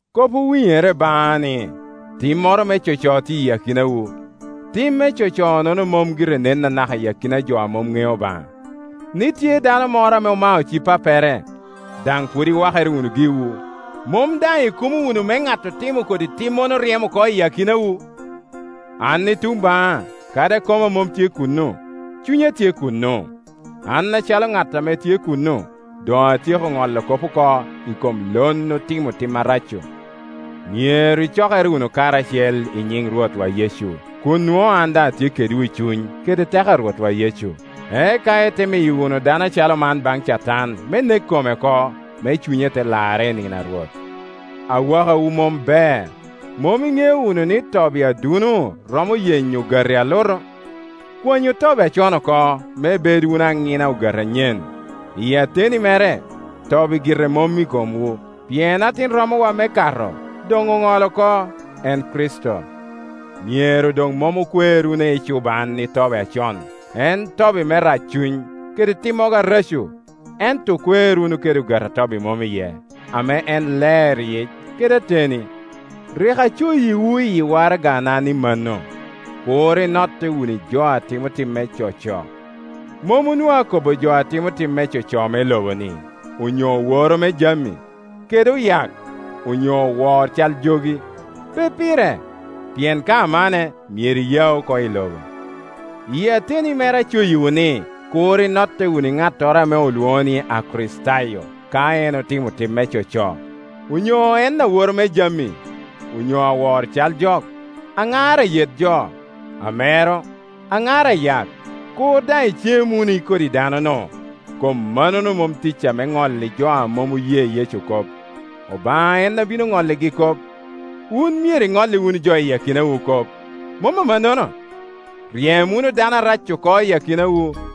Kop owinyere baŋa ni timmoro me coco tye i akinawu. Tim me coco-nono mom gire nen anaka iyi akina jo a mom ŋeo Obaŋa, ni tye dano moro ame omao ci-pappere. 2Daŋ pwod iwakere wunu giwu! Mom daŋ ikumo wunu me ŋat otimo kodi timmono ryem oko i akinawu? 3An i tuŋ baŋa, kadi koma mom tye kuno, cunya tye kuno; an acalo ŋat ame tye kuno doŋ atyeko ŋolo kop oko i kom lon otimo tim arac-cu. 4Myero icokere wunu karacel nyiŋ Rwotwa Yecu, kun nwoŋo an daŋ atye kedwu i cuny kede teko a Rwotwa Yecu. Eka ite miyo wunu dano acalo man baŋ Catan me nek kome oko, me cunye te larre i nino a Rwot. Awakawu mom ber. Mom iŋeo wunu ni tobi aduno romo yenyo ogati alutu? Kwanyu tobi acon oko, me ibed wunu aŋina ogati anyen; iyi ateni mere tobi gire mom i komwu. Pien atin romowa me Kato doŋ oŋolo oko, en Kricito. Myero doŋ mom okwer wunu ecuban i tobi acon, en tobi me raccuny kede timmogo areco, ento okwer wunu kede ogati a tobi mom iye, ame en ler yic kede ateni. Rik acoyiwu iyi waragana ni mano, kur inotte wunu i jo a timo tim me coco. Mom onwoŋo akobo jo a timo tim me coco me lobo-ni, onyo oworo me jami, kede oyak, onyo owor cal jogi; pe pire; pien ka amanne myero iyau oko i lobo. Iyi ateni mere acoyiwu ni kur inotte wunu i ŋattoro ame olwoŋo ni. Akricitayo, ka en otimo tim me coco, onyo en aworo me jami, onyo awor cal jok, aŋar ayet jo, amero, aŋar ayak; kur daŋ icem wunu i kodi dano-nu. Kom mannono mom ticca me ŋolli jo a mom oye Yecu kop. Obaŋa en abino ŋolligi kop. Wun myero iŋolli wunu jo a tye i akinawu kop, mom amannono? Ryem wunu dano arac-cu oko i akinawu.